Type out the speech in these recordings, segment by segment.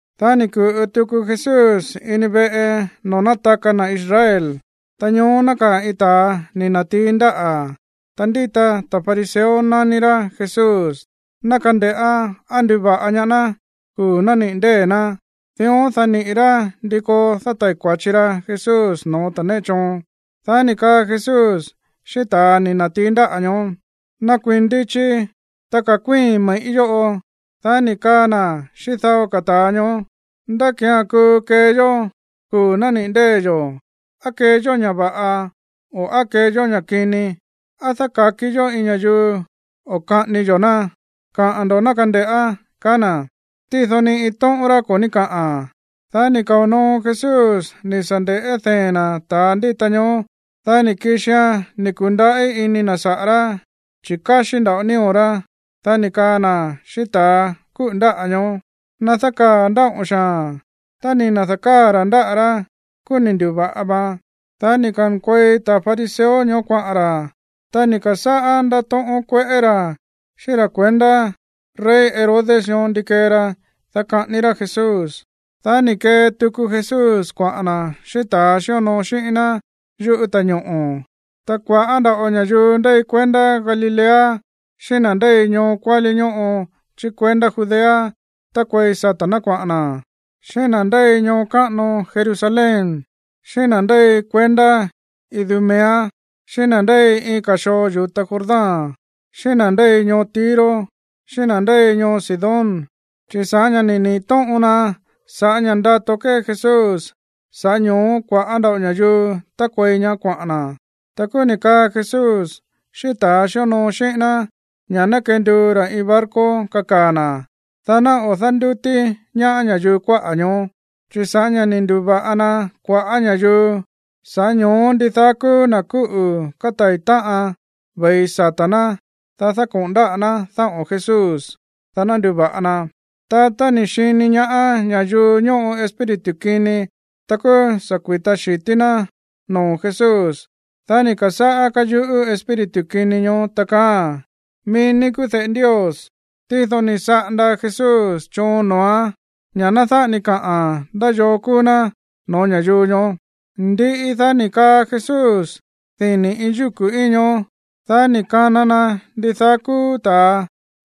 Dá ni̱ ku̱ꞌu tuku Jesús ini veꞌe noo̱ nátaka na̱ Israel. Ta ñoó nákaa̱ iin ta̱a ni̱ na̱tií ndáꞌa̱. Ta ndíta ta̱ fariseo nání rá Jesús, ná kande̱ꞌá á nduva̱ꞌa ñaá ná kuu̱ nániꞌi̱ ndée̱ ná. Dión, dá niꞌi̱ rá ndí koo dátai̱ kua̱chi ra Jesús no̱ó ta̱ néꞌe choon. Dá ni̱ kaa Jesús xíꞌín ta̱a ni̱ na̱tií ndáꞌa̱ ñoó: ―Nakuii̱n ndichi, ta ka̱kuíi̱n me̱ꞌí yóꞌo. Dá ni̱ kaa na̱ xíꞌín dao ka̱ ta̱a ñoó: ―¿Ndá ki̱án kuu kee yó kuu̱ nániꞌi̱ ndée̱ yo̱? ¿Á kee yó ña̱ va̱ꞌa o á kee yó ña̱ kini? ¿Á dáka̱kió iin ña̱yuu o kaꞌání yó ná? Kaꞌa̱n ndo̱ ná nde̱ꞌá ―kaá na̱. Tído ni iin tóꞌón rá ko̱ ní káꞌa̱n. Dá ni̱ kao̱ noo Jesús ni̱ sa̱ nde̱ꞌé dee̱n ná ta̱a ndíta ñoó. Dá ni̱ kixia̱n ni̱ ku̱ndaꞌí ini na̱ saꞌa̱ rá, chi̱ káxí nda̱ꞌo nío̱ rá. Dá ni̱ kaa na̱ xíꞌín ta̱ kúꞌu̱ ndáꞌa̱ ñoó: ―Ná dákaa̱ ndáꞌo̱n xaa̱n. Tá ni̱ na̱da̱káa̱ ra̱ ndáꞌa̱ rá, kúú ni̱ ndu̱va̱ꞌa vaan. Dá ni̱ ka̱nkuei ta̱ fariseo ñoó kuaꞌa̱n ra̱. Ta ni̱ ka̱sáꞌá ndátóꞌón kueꞌé ra̱ xíꞌín ra̱ kuendá rey Herodes ñoó ndi kee ra, dá kaꞌání rá Jesús. Dá ni̱ kee tuku Jesús kuaꞌa̱n na̱ xíꞌín ta̱ xíonoo xíꞌín ná yuꞌú ta̱ñoꞌo̱. Ta kua̱ꞌá nda̱ꞌo ña̱yuu ndéi kuendá Galilea xíꞌín na̱ ndéi ñoo kuálí ñóꞌo chí kuendá Judea tákuei sata̱ ná kuaꞌa̱n na̱, xíꞌín na̱ ndéi ñoo káꞌano Jerusalén, xíꞌín na̱ ndéi kuendá Idumea, xíꞌín na̱ ndéi iin ka̱ xoo yu̱ta Jordán, xíꞌín na̱ ndéi ñoo Tiro xíꞌín na̱ ndéi ñoo Sidón, chi̱ sa̱ꞌá ña̱ ni̱ niꞌi̱ tóꞌon na sa̱ꞌá ña̱ꞌa ndato kée Jesús, sa̱ꞌá ño̱ó kua̱ꞌá nda̱ꞌo ña̱yuu tákuei ñaá kuaꞌa̱n na̱. Ta kúú ni̱ kaꞌa̱n Jesús xíꞌín ta̱ xíonoo xíꞌín ná ña̱ ná kenduu ra̱ iin barco kakaa̱ na̱, dá ná o̱ dándútí ñaá ña̱yuu kuáꞌa̱ ñoó. Chi̱ sa̱ꞌá ña̱ ni̱ ndu̱va̱ꞌa na kua̱ꞌá ña̱yuu, sa̱ꞌá ño̱ó ndidaá kúú na̱ kúꞌu̱ kátai̱ táꞌan ve̱i sata̱ ná, dá kako̱ꞌon na dáꞌo̱n Jesús, dá ná nduva̱ꞌa na. Ta tá ni̱ xini ñaá ña̱yuu ñóꞌo espíritu kini, ta kúú sa̱ kui̱ta xi̱tí ná noo̱ Jesús. Dá ni̱ ka̱sáꞌá káyuꞌú espíritu kini ñoó, ta kaáa̱n: ―Mií ní kúú de̱ꞌe Ndios. Tído ni̱ saꞌanda Jesús choon noo̱án ña̱ ná dáꞌa ni kaꞌa̱n ndá yoo kúú ná no̱ó ña̱yuu ñoó. Ndiꞌi, dá ni̱ kaa Jesús dini̱ iin yúku̱ íin ñoó. Dá ni̱ kana na ndidaá kúú ta̱a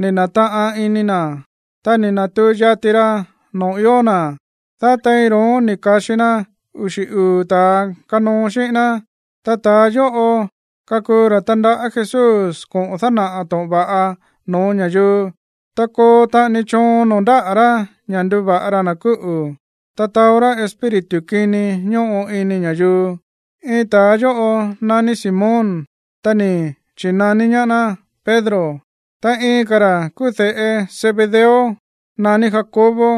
ni̱ na̱taꞌan ini na̱, ta ni̱ na̱tuu yati ra noo̱ ió na̱. Dá tein ro̱ón ni̱ ka̱xi na uxi̱ uu̱ ta̱a kanoo xíꞌín ná. Ta ta̱a yóꞌo kakuu ra̱ tandaꞌá Jesús koꞌo̱n dánaꞌa̱ to̱ꞌon va̱ꞌa no̱ó ña̱yuu, ta koo taꞌani choon noo̱ ndáꞌa̱ rá ña̱ nduva̱ꞌa ra na̱ kúꞌu̱, ta taó rá espíritu kini ñóꞌo ini ña̱yuu. Iin ta̱a yóꞌo naní Simón. Ta ni̱ chi̱naní ñaá ná Pedro. Ta iin ka̱ ra̱ kúú de̱ꞌe Zebedeo naní Jacobo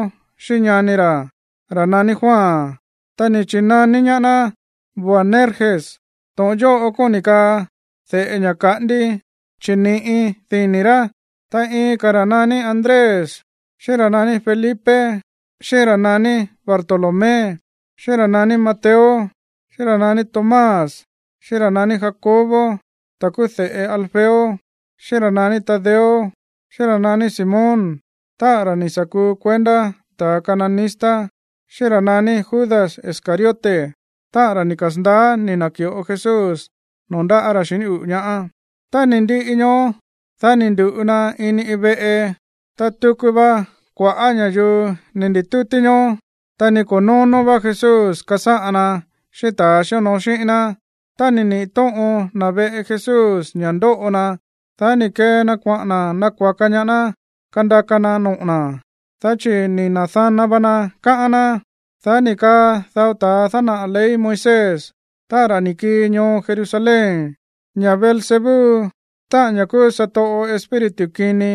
xíꞌín ñani ra̱, ra̱ naní Juan. Ta ni̱ chi̱naní ñaá ná Boanerges. To̱ꞌon yóꞌo kóni̱ kaa de̱ꞌe ña̱ kaꞌándí, chi̱ ni̱ꞌi dini̱ rá. Ta iin ka̱ ra̱ naní Andrés, xíꞌín ra̱ naní Felipe, xíꞌín ra̱ naní Bartolomé, xíꞌín ra̱ naní Mateo, xíꞌín ra̱ naní Tomás, xíꞌín ra̱ naní Jacobo, ta̱ kúú de̱ꞌe Alfeo, xíꞌín ra̱ naní Tadeo, xíꞌín ra̱ naní Simón, táꞌa̱n ra̱ ni̱ sa̱ kuu kuendá ta̱ cananista, xíꞌín ra̱ naní Judas Iscariote, táꞌa̱n ra̱ ni̱ kasa̱ndaá ni̱ na̱ki̱ꞌo Jesús noo̱ ndáꞌa̱ ra̱ xiní uꞌu̱ ñaá. Tá ni̱ ndiꞌi ñoó, dá ni̱ ndu̱ꞌu na ini iin veꞌe. Ta tuku va kua̱ꞌá ña̱yuu ni̱ ndi̱tútí ñoó. Ta ni ko̱ nóno̱ vá Jesús kasáꞌan na xíꞌín ta̱a xíonoo xíꞌín ná. Tá ni̱ niꞌi̱ tóꞌon na̱ veꞌe Jesús ña̱ ndóꞌo na, dá ni̱ kee na kuaꞌa̱n na̱ nakua̱ka ñaá ná kandaka na noꞌo̱ na̱, dá chi̱ ni̱ na̱dana va na, káꞌán ná. Dá ni̱ kaa dao ta̱a dánaꞌa̱ ley Moisés, táꞌa̱n ra̱ ni̱ kii ñoo Jerusalén, ña̱ Beelzebú, táꞌa̱n ña̱ kúú satoꞌo espíritu kini,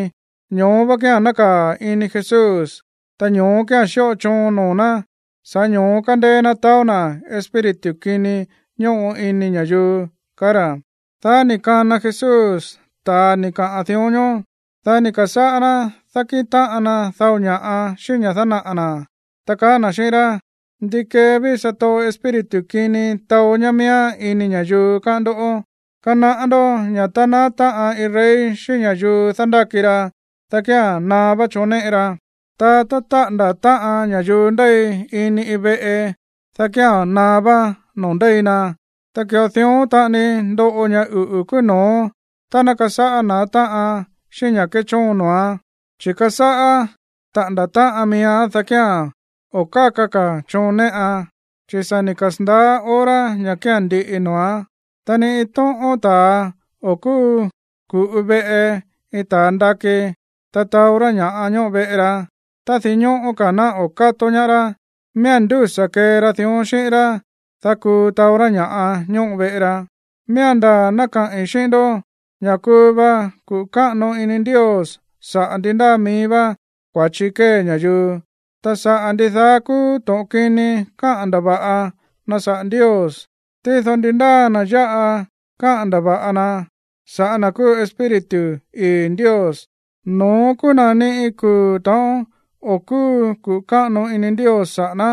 ño̱ó vá kía̱n nákaa̱ ini Jesús, ta ño̱ó kía̱n xíꞌo choon noo̱ ná, sa̱ꞌá ño̱ó kándéé ná taó na̱ espíritu kini ñóꞌo ini ña̱yuu, kaá ra̱. Dá ni̱ kana Jesús ta̱a ni̱ kaꞌa̱n dión ñoó, dá ni̱ ka̱sáꞌá ná dákíꞌin táꞌan na dao ña̱ꞌa xíꞌín ña̱ dánaꞌa̱ na̱, ta kaá na̱ xíꞌín rá: ―¿Ndi kee ví satoꞌo espíritu kini taó ñá miíán ini ña̱yuu, káꞌán ndó? Kanaꞌá ndó ña̱ tá naá táꞌan iin rey xíꞌín ña̱yuu dándáki ra, dá kía̱n naá vá choon néꞌe ra. Ta tá táꞌa̱nda̱ táꞌan ña̱yuu ndéi ini iin veꞌe, dá kía̱n naá vá noo̱ ndéi na. Ta ki̱ꞌo dión taꞌani ndoꞌo ña̱ uꞌu̱ kúú no̱ó tá ná kasáꞌá na̱á táꞌan xíꞌín ña̱ kéchoon noo̱án. Chi̱ kasáꞌá taꞌa̱nda̱ táꞌan miíán, dá kía̱n o̱ káka ka̱ choon néꞌan, chi̱ sa̱ ni̱ kasa̱ndaá hora ña̱ kía̱n ndiꞌi noo̱án. ’Ta ni iin tóꞌón ta̱a o̱ kúu ku̱ꞌu veꞌe iin ta̱a ndakí, ta taó rá ña̱ꞌa ñóꞌo veꞌe ra, tá dinñóꞌó ka̱ ná o̱ kátó ñaá rá. Miía̱n ndúsa̱ kee ra dión xíꞌín rá, dá kuu taó rá ña̱ꞌa ñóꞌo veꞌe ra. Miía̱n ndaa̱ ná kaꞌi̱n xíꞌín ndó ña̱ kuu va kuꞌu̱ káꞌano ini Ndios sa̱ꞌá ndi ndáa mií vá kua̱chi kée ña̱yuu, ta saꞌa̱ ndidaá kúú to̱ꞌon kini káꞌa̱n ndava̱ꞌa na̱ saꞌa̱ Ndios. Tído ndi ndáa na̱ ya̱ꞌa káꞌa̱n ndava̱ꞌa na saꞌa̱ na̱ kúú Espíritu ii̱ Ndios, no̱ón kúú na̱ ni iin kuu̱ ta̱ꞌón o̱ kúu kuꞌu̱ káꞌano ini Ndios saꞌa̱ ná.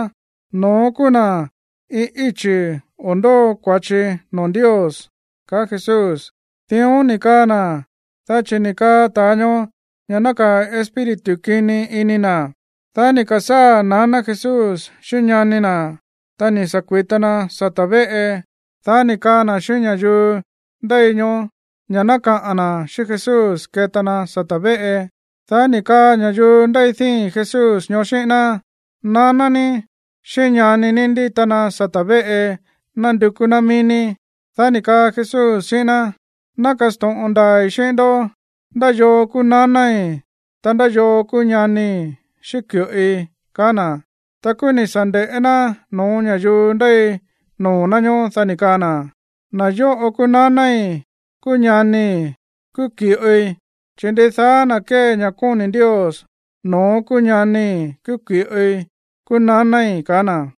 No̱ón kúú na̱ iin íchi̱ o̱ ndóo kua̱chi noo̱ Ndios ―kaá Jesús. Dión ni̱ kaa na̱, dá chi̱ ni̱ kaa ta̱a ñoó ña̱ nákaa̱ espíritu kini ini na̱. Dá ni̱ ka̱sáa̱ naná Jesús xíꞌín ñani na̱. Ta ni̱ sa̱ kui̱ta na sata̱ véꞌe. Dá ni̱ kaa na̱ xíꞌín ña̱yuu ndéi ñoó ña̱ ná kaꞌa̱n na̱ xíꞌín Jesús keta na sata̱ véꞌe. Dá ni̱ kaa ña̱yuu ndéi díi̱n Jesús ñoó xíꞌín ná: ―Naná ní xíꞌín ñani ní ndíta na sata̱ véꞌe nándukú ná mií ní. Dá ni̱ kaa Jesús xíꞌín ná: ―Ná kasto̱ꞌon ndaa̱i̱ xíꞌín ndó ndá yoo kúú nanái̱, ta ndá yoo kúú ñanii̱ xíꞌín ki̱ꞌoi ―kaá na̱. Ta kúú ni̱ sa̱ nde̱ꞌé ná no̱ó ña̱yuu ndéi noo̱ ná ñóó. Dá ni̱ kaa na̱: ―Na̱ yóꞌo kúú nanái̱, kúú ñanii̱, kúú ki̱ꞌoi. Chi̱ ndidaá na̱ kée ña̱ kóni̱ Ndios, no̱ón kúú ñanii̱, kúú ki̱ꞌoi, kúú nanái̱ ―kaá na̱.